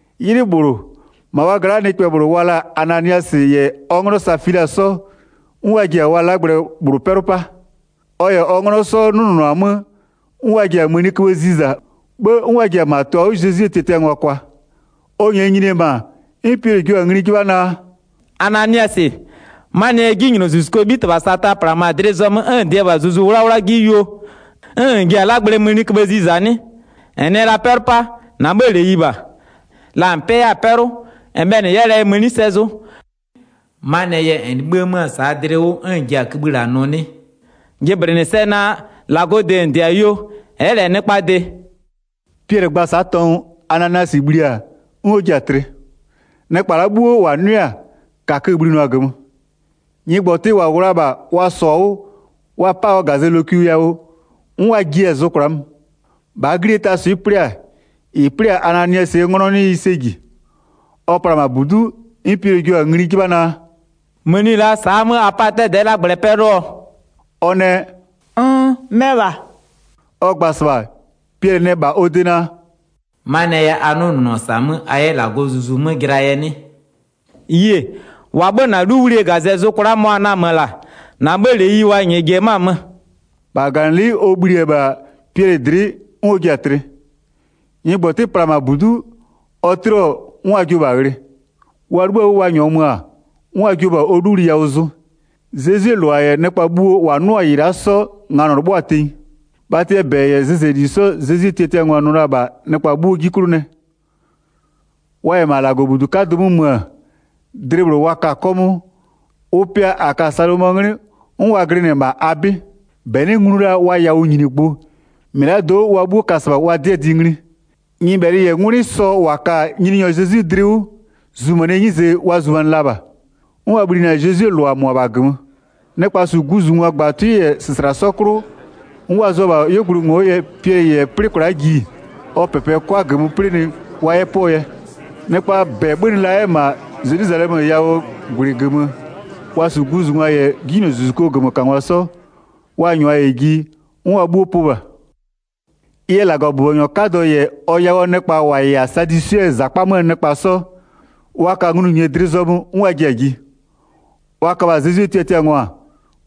'Ylɩ -bhlʋ, -ma wa gla'aa nɩkpɛ -bhlʋ wa la-a Ananiasɩ -yɛ ɔ 'nglɔ Safila 'sɔ, 'n wa ji-a wa 'lagblɛ -bhlʋ 'pɛlʋ 'pa. Ɔ -yɛ ɔ 'nglɔ 'sɔ 'nʋnʋnʋ-a 'mö, 'n ɔ ji-a mëniköbhë ziza, 'bhë 'n ɔ ji-a -ma tʋ-a 'wʋ Zezwie tiatiangwa kwa. Ɔ -nyɛɛ nyini-e -ma, 'n Piɛlɩ jio-a ngli 'jɩbha naa: “Ananiasɩ, 'manɩɛ yɛ 'jinylozuzukuo 'bhitɩbha Sata -plamö-a dlɩ zɔmö 'n -n dɩ-ɛ -bha Zuzu 'Wlawla 'ji 'klʋ yuo, 'n -n ji-a 'lagblɛɛ mëniköbhë ziza 'nɩ? 4-N nɩɛ la 'pɛlʋ 'pa -na 'bhëë -leyi -bha. La -n 'pɛ 'yɛ-a 'pɛlʋ, -n bhɛlɩ n 'yɛ la ɛ mëni sɛ zʋ. 'Manɩɛ yɛ -n 'libhï-a 'mö-a -saa dlɩ 'wʋ 'n -n ji-a kïbhï -la nʋ 'nɩ? Jɩblɩnɩ sɛ naa, -Lagɔɔ de -n -dɩ-a yuo, ɛ'ɛ -lɛ nɩkpaa de.” Piɛlɩ gba-a sa'a tɔngʋ, Ananiasɩ bhli-a, 'n ɔ ji-a tlɩ. Nɩkpa la'a 'bhuo -wa 'nʋɩ-a, -kakö-ö bhlinʋa-a -gömö. Nyɩgbɔtɩ -wa -wʋ la-a -bha wa -sɔ-a 'wʋ, wa 'pa-a ɔ -gazɛ lokwi yawʋ, 'n wa jiɛ-a zʋ kwla'a mö. 7-Bhaa 'glie taa swɩ'ɩ 'plɩ-a, -ɩ 'plɩ-a Ananiasɩɛ 'nglɔ 'nɩ ɩ sɛ -ji. Ɔ pla-a -ma -budu'u, 'n Piɛlɩ jio-a ngli 'jɩbha naa: “Mëni la'a sa'aa 'mö a 'pa-a 'dɛdɛ'ɛ 'lagblɛ 'pɛlʋɔ?” Ɔ nɛ: “Nn, mɛ -bha.” Ɔ gba-a -sɩbha, Piɛlɩ nɛ -bha ɔ de naa: “'Manɩɛ yɛ a 'nʋnʋnʋ-ɔ -sa 'mö a 'yɛ -Lagɔɔ Zuzu 'mö jɩlaa yɛ 'nɩ? Yie, -wa 'bhö-ö -na 'luwlie -gazɛ zʋ kwla'a mʋa-a namö-ö -la, -na 'bhëë -leyi wa -nyɛɛ ji-e 'mö-a möö.” 10-Bha -gaganɩlɩ'ɩ ɔ bhli-e -bha Piɛlɩ dlɩ'ɩ 'n ɔ ji-a tlɩ. Nyɩgbɔtɩ pla-a -ma -budu'u, ɔ 'tlɩɔ 'n wa jio-o -bha ghlɩ. Wa 'libhïo-a 'wʋ wa -nyɔɔ mö-a, 'n wa jio-o -bha ɔ 'luwli yawʋ zʋ. Zezwie -lʋa -yɛ nɩkpa bhuo -wa 'nʋ-a -ɩ la'a 'sɔ, nganɔ 'lɩbhʋa-a tenyi. Bhatɩɛ -bɛ -yɛ zɩzɛli 'sɔ Zezwie tiatiangwa nʋ la-a -bha nɩkpa 'bhuo 'ji 'klʋ nɛ. Wa -yɛ -ma -Lagɔbudu 'kadʋ 'mö mö-ö, dlɩ -bhlʋ wa ka-a 'kɔmʋʋ, ʋ pɩa -a ka-a Salomɔɔ 'nglɩ 'n wa glɩnɩ-ɛ -ma a 'bɩ. 13-Bɛ 'nɩ nglu la wa yawʋnyinigbʋ, -mɩlado'o wa 'bhuo ka -sɩbha wa 'dɩɛ dɩ ngli. Nyɩbhɛlɩ -yɛ 'ngwlɩ sɔ -wa ka-a Nyininyɔ Zezwi dlɩ 'wʋ, zumanɩɛ 'nyize wa zumanɩ la -bha. 'N wa bhlinɩ-a Zezwie -lʋa -mʋabha -gömö. Nɩkpa -su guzungwa -gbatʋɩ -yɛ -sɩsla 'sɔ 'klʋ, 'n wa zʋa-a -bha 'yuogblʋɩ ngo'o yɛ, Piɛlɩ -yɛ 'plɩ kwla'a ji, ɔ -pɛpɛ 'kʋa -gömö 'plɩnɩ wa 'yɛ 'pʋɔ yɛ. Nɩkpaa -bɛ 'bhönɩ la 'yɛ-ɛ -ma Zelwizalɛmö yawʋɔ -gwlɩ -gömö, wa -su guzungwa -yɛ 'jinylozuzukuo -gömökangwa 'sɔ, wa -nyʋa -yɛ ji 'n wa 'bhuo pʋ -bha. Ɩ yɛ -Lagɔbʋbɔnyɔ 'kadɔ -yɛ ɔ yawʋɔ nɩkpa -wa -yɛ-a Sadwisɩɛ -zakpa 'möö nɩkpa 'sɔ, wa ka nglʋnyinye dlɩ zɔmö 'n wa ji-a ji. Wa köbha-a Zezwie tiatiangwa,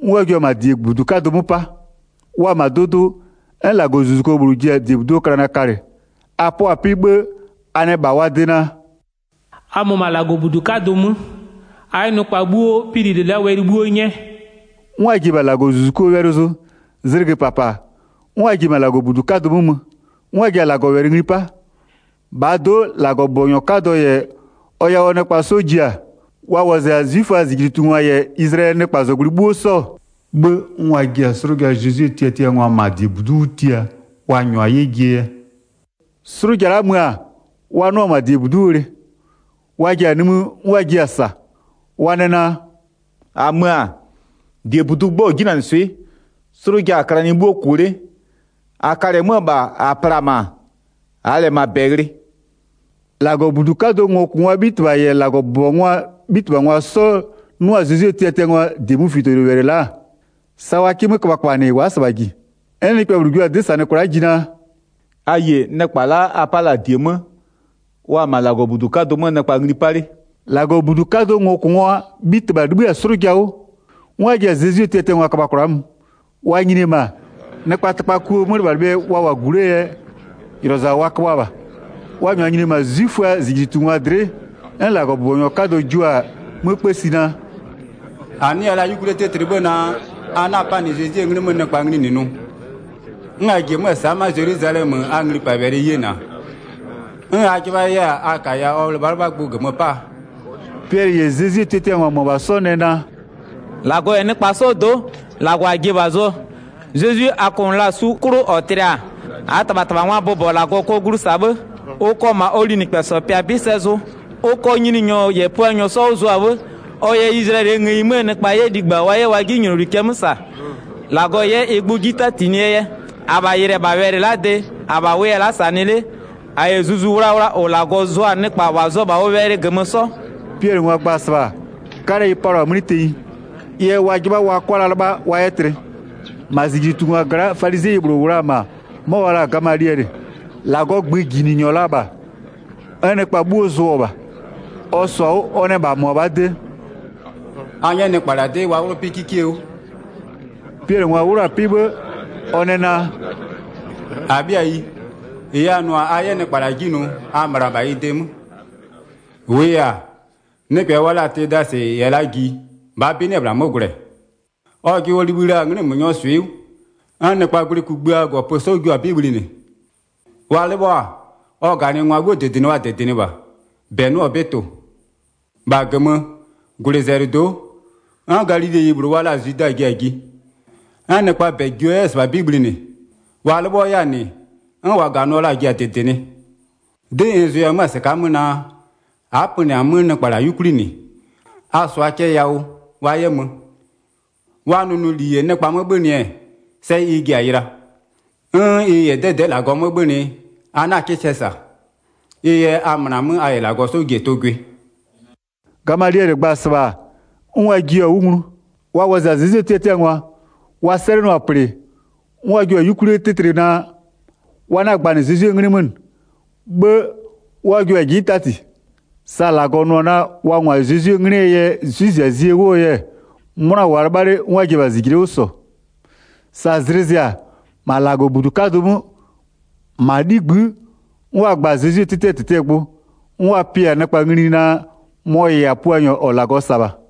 'n wa jua-a -ma -diebudu 'kadʋ 'mö 'pa. Wa-a -ma dʋdʋ, 'n -Lagɔzuzuko -bhlʋ ji-a -diebuduo klanɩ kalɩ, a 'pʋa-a 'pɩ, 'bhë a nɛ -bha wa de naa: “A mö -ma -Lagɔbudu 'kadʋ 'mö, a 'yɛ nɩkpa 'bhuo pɩ -lile la'aa wɛlɩ 'bhuo 'nyɛ.” 'N wa ji-e -bha -Lagɔzuzukoo wɛlɩ zʋ, zlɩgö -papa, 'n wa ji-e -ma -Lagɔbudu 'kadʋ 'mö mö, 'n wa ji-a -Lagɔwɛlɩ ngli 'pa. -Bhaa do'o -Lagɔbʋbɔnyɔ 'kadɔ -yɛ ɔ yawʋɔ nɩkpa 'sɔ ji-a, wa wɔzɩ-a 'zwiföaa -zijlitungwa -yɛ Izlayɛlɩɛ nɩkpazɔgblʋɩ 'bhuo 'sɔ, 'bhë 'n wa ji-a 'slʋja Zezwie tiatiangwa -ma -diebudu'u 'wʋ tia, wa -nyʋa 'yɛ jie yɛ. 'Slʋja la'a mö-a, wa 'nʋa-a -ma -diebudu'u ghlɩ. Wa ji-a nimï 'n wa jiɩ-a -sa. Wa nɛ naa: “-A mö-a, -diebudu 'gbɔ-ɔ 'jinanɩswɩ'ɩ, 'slʋja-a klanɩ 'bhuo -kʋ 'le. -A kalɩ-ɛ 'mö-ö -bha -a pla-a -ma, -aa -lɛ -ma -bɛ ghlɩ.” 24-Lagɔbudu 'kadʋɔ ngokʋngwaa 'bhitɩbha -yɛ -Lagɔbʋbɔngwaa 'bhitɩbhangwa 'sɔ 'nʋ-a Zezwie tiatiangwaa -diemöfitowɛlɩ la'a, sa wa 'kɩ 'mö köbhaköbhanɩ wa'a -sɩbha -ji. 'N nɩkpɛ -bhlʋ jua-a 'dɩ -sanɩ kwla'a ji naa: “A yie, nɩkpa la'a a 'pa la-a -die 'mö, wa-a -ma -Lagɔbudu 'kadʋ 'mö nɩkpa ngli 'pa 'le.” 26-Lagɔbudu 'kadʋɔ ngokʋngwaa 'bhitɩbha 'libhï-a 'slʋja 'wʋ, 'n wa ji-a Zezwie tiatiangwa köbha kwla'a mö. Wa nyini-e -ma, nɩkpaa tɩkpakuo 'mölɩbhalɩbhɩɛ wa -wʋ-a -gu 'lee yɛ, -ylɔza wa köbhʋa -bha. Wa -nyʋa nyininɩ-ɛ -ma 'zwiföaa -zijlitungwa dlɩ'ɩ, 'n -Lagɔbʋbɔnyɔ 'kadɔ jua-a 'mö 'kpësi naa: “-A 'nɩya la 'yukwlie 'tɩtlɩ 'bhë naa, a 'na-a 'panɩ Zezwie 'nglɩ 'mö nɩkpa ngli -nɩ nʋ? 'N a ji-e 'mö-a sa'a ma'a Zelwizalɛmö a nglipawɛlɩ yena, 'n a 'jɩbha 'yɛ-a a -kaya ɔ 'lɩbhalɩbhagbʋ -gömö 'paa?” Piɛlɩ -yɛ Zezwie tiatiangwa -mʋabha 'sɔ nɛ naa: “-Lagɔ -yɛ nɩkpa 'sɔɔ do'o, -Lagɔ -a ji-e -bha zʋɔ. Zezwi a kʋnʋ la-a su 'klʋ -ɔ tlɩ-a, -aa -tɩbhatɩbhangwaa bʋbɔ -Lagɔ kɔ glu -sa 'bhë. Ʋ kɔ -ma ʋ -ma ʋ linɩkpɛsɔ pɩa 'bɩ sɛ zʋ, ʋ kɔ Nyininyɔ -yɛ Puanyɔ 'sɔ 'wʋ zʋa 'bhë, ɔ yɛ Izlayɛlɩɛ ngëyi 'möö nɩkpa 'yɛ ligba wa 'yɛ wa 'jinyloli cɛ 'mö -sa, -Lagɔ 'yɛ ɩ gbʋ 'ji 'tatinɩɛ yɛ. 32-Abha yɩlɩ-ɛ -bha wɛlɩ la'aa de -abha wʋya-a la'a -sanɩ 'le, a -yɛ Zuzu Wlawla -ʋ -Lagɔ zʋ-a nɩkpa -wa zʋ-ɔ -bha ʋ wɛlɩ -gömö 'sɔ.” Piɛlɩngwa gba-a -sɩbha, 'kalɛ ɩ palʋa-a 'mlɩ tenyi, ɩ yɛ wa 'jɩbha wa 'kʋa la 'lɩbha wa 'yɛ tlɩ. 34-Ma -zijlitungwa gla'a, falizɩɛyi -bhlʋ -wʋ la-a -ma, 'mɔ wa la-a Gamaliɛlɩ, -Lagɔɔ gböjinɩnyɔ la -bha, 'n nɩkpa 'bhuo zʋɔ-ɔ -bha. Ɔ -sɔ-a 'wʋ, ɔ nɛ -bha -mʋabhaa de: “A 'nyɛ nɩkpa -la 'dɩ wa 'wlʋ 'pɩ 'kikie 'wʋ.” Piɛlɩngwa 'wlʋ-a 'pɩ 'bhë, ɔ nɛ naa: “-Abhɩayi, -ɩ a nʋ-a a 'yɛ nɩkpa -la 'ji nʋ, a möna -bha ɩ de 'mö. 36-Wʋʋ yɛ-a, nɩkpɛ wa la-a Tesadɩ yɛ la ji -bhaa 'bɩ 'nɩ-ɛ -bhla 'mö gwlɛ. Ɔjɩ ɔ libhï la-a 'nglɩmönyɔɔ swɩ'ɩ 'wʋ. 'N nɩkpaa gwlɩ kugbïaa -gɔpö 'sɔ jio-a 'bɩ bhlinɩ. Wa 'lɩbhɔ-a, ɔ -ganɩngwa 'bhuo -dɩdɩnɩ wa -dɩdɩnɩ -bha, -bɛ 'nɩ-ɛ -bha tʋ-ʋ. 37-Bha -gömö -gwlɩzɛlɩdo'o, 'n Galileyi -bhlʋ wa la-a Zwida ji-a ji, 'n nɩkpaa -bɛ jio 'yɛ-a -sɩbha 'bɩ bhlinɩ. Wa 'lɩbhɔ 'yɛ-a -nɩ, 'n -wa -ganɩɔ la-a ji-a -dɩdɩnɩ. 'Dɩ n zʋya 'mö-a -sɩka'a 'mö naa, a'a pönɩ-a 'mö nɩkpa -la 'yukwli -nɩ, a -sʋa cɛ yawʋ wa 'yɛ mö. Wa nʋnʋli -yɛ nɩkpa 'mö 'bhönɩ-ɛ, sɛ ɩ ji-a yɩla. 'N ɩ -yɛ 'dɛdɛ'ɛ -Lagɔ 'mö 'bhönɩ-ɛ, a 'na 'kɩ sɛ -sa. Ɩ yɛ a möna 'mö a -yɛ -Lagɔ 'sɔ ji-e tʋ gwɩ.” Gamaliɛlɩ gba-a -sɩbha 'n wa jiɩ-a 'wʋ nglu. Wa wɔzɩ-a Zezwie tiatiangwa, wa sɛlɩnʋa-a -plɩ, 'n wa jua-a 'yukwlie 'tɩtlɩ naa, wa 'na-a gbanɩ Zezwie 'nglɩ 'mö -nɩ, 'bhë 'n wa jua-a 'ji 'tati. Sa -Lagɔ nʋ-ɔ naa wa -ngwa Zezwie 'nglɩɛ yɛ 'zwɩziazie 'wʋɔ yɛ 'mʋna -wʋʋa 'lɩbha 'le 'n wa ji-e -bha -zijle'e 'wʋ -sɔ. Sa zlɩ zɩ-a, -ma -Lagɔbudu 'kadʋ 'mö, -ma 'ligbï'ï, 'n wa gba-a Zezwie 'tɩtɩɛ -tɩtɩɛ gbʋ, 'n wa pɩ-a nɩkpa ngli naa mɔ-ɔ -yɛ-a Puanyɔ -ɔ -Lagɔ -sa-a -bha.